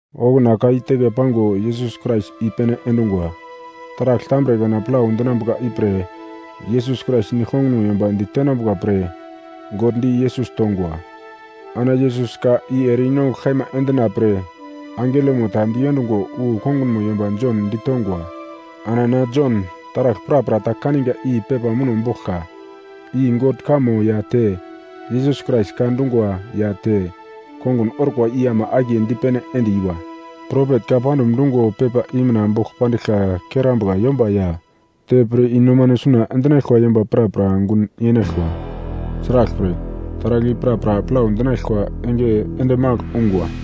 Okuna ka i teke pango Yesus Krais i-pene endungwa. Taragl tambre kana plau dinambuka ipre Yesus Krais nigl kongunmo yomba ditenambuka pre God di Yesus tongwa. Ana Yesus ka i ere i-nongugl kaima endina pre angelomo ta di endungo wu kongunmo yomba Jon ditongwa. Ana na Jon taragl prapra ta kaninga i pepa muno boglka, i God kamo ya te Yesus Krais ka dungwa ya te kongun orkwa i ama akiye dipene end-iwa. Propet ka pandum dungo pepa i mina bogl pandiglka kerambuka yomba ya, te pir i-nomano suna endinaglkwa yomba prapra gun yenaglkwa. Sraglpre, taragl i prapra plau dinaglkwa enge ende magl ungwa.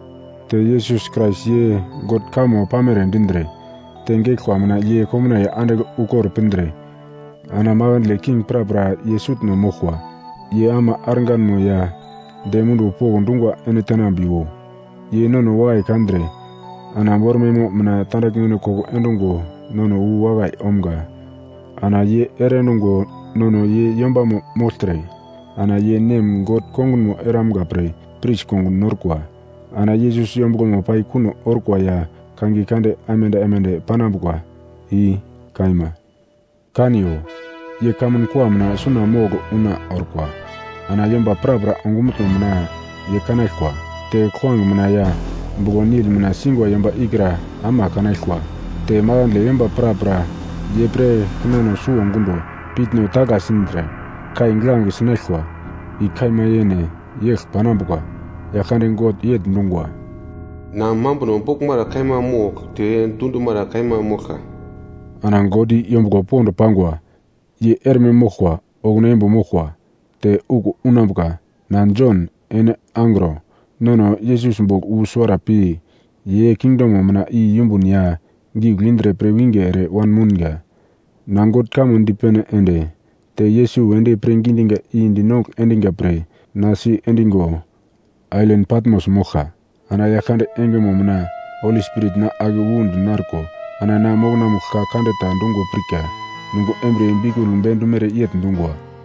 Te Yesus Krais ye God kamo pamere dindre, te geglkwa mina ye komnaiye andigl ukor pindre ana makandle king prapra ye sutno moglkwa. Ye ama arganmo ya dem munduwo pokndungwa ene tenambiwo. Ye nono wakai kandre ana bormaimo mina tandaglmeno koko endungo nono wu wakai omga. Ana ye ere endungo nono ye yombamo mogltre ana ye Nem God kongunmo eramga pre pris kongun norkwa. Ana Yesus yombuglomo pai kuno orkwa ya kangiye kande aimande aimande panambuka. I kaima. Kaniyo, ye kamun kua mina suna mogl una orkwa, ana yomba prapra ongumutno mina ye kanaglkwa, te kuglange mina ya buglo-nil mina singwa yomba ikra ama kanaglkwa. Te makandle yomba prapra ye pre kinano suwo gundo piutno tagla sindre kai giglange sinaglkwa. I kaima yene, yegl panambuka. Yaglkande God yegl dungwa, “Na mambuno boglmara kaima mogl te dundumara kaima moglka.” Ana God i yombuglo pond pangwa ye erme moglkwa okuna imbo moglkwa te okuwo unambuka. Na Jon, ene angro, nono Yesus bogl wu suwara pi ye kingdomo mina i yumbun ya giugl indre pirwinge ere wanmounga. Na God kamo dipene ende te Yesus wedi pirngi diga i dinongugl endiga pre na sendigo ailan Patmos moglka. Ana Yaglkande engemo mina Holi Spirit na ake wu dinarko ana na mokonamugl ka kande ta dungo pirka. Nungo embriye biukul bendumere yegl dungwa.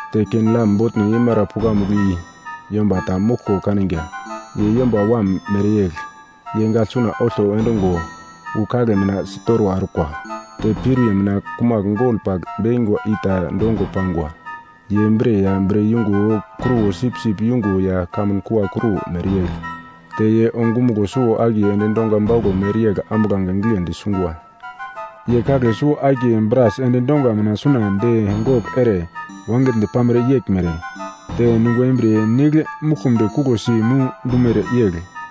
Te ken-lam botno yeimara pukamugl i yomba ta moglko kaniga. Ye Yomba Wam mereyegl. Ye gagl suna olto endungo wu kagle mina sitorwa orkwa, te piuriye mina kumagl gol pagl bekingwa i ta dongo pangwa. Ye bre ya bre yungo kruwo sipsip yungo ya kamun kua kruwo mereyegl, te ye ongumuglo suwo-akiye endi donga bauglo mereyegl ambuglange giglendi sungwa. Ye kagle suwo-akiye bras endi donga mina suna de gogl ere wangigldi pamere yeglmere, te nungo embriye nigl muglkumdi kuglosi mu dumere yegl.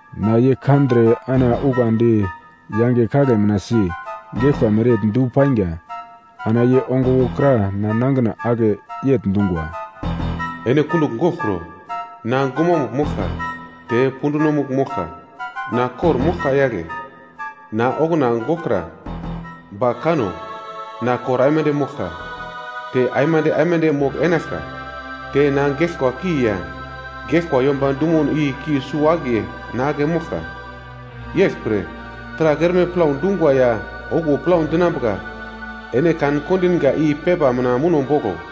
Na ye kandre ana ukandi yange kagle mina si, geglkwa mereyegl du painga. Ana ye ongo wokra na nangina ake yegl dungwa, “Ene kundugl goglkro! Na gumamugl moglka te pundunomugl moglka. Na kor-moglka yagle! Na okuna goglkra, ba kano, na kor aimande moglka, te aimande aimande mogl enaglka. Te na geglkwa ki ya geglkwa yomba dumono i ki suwo-akiye na ake moglka. “Yeglpre, taragl erme plau dungwa ya okuwo plau dinambuka ene kan-kondinga i pepa mina muno boglo.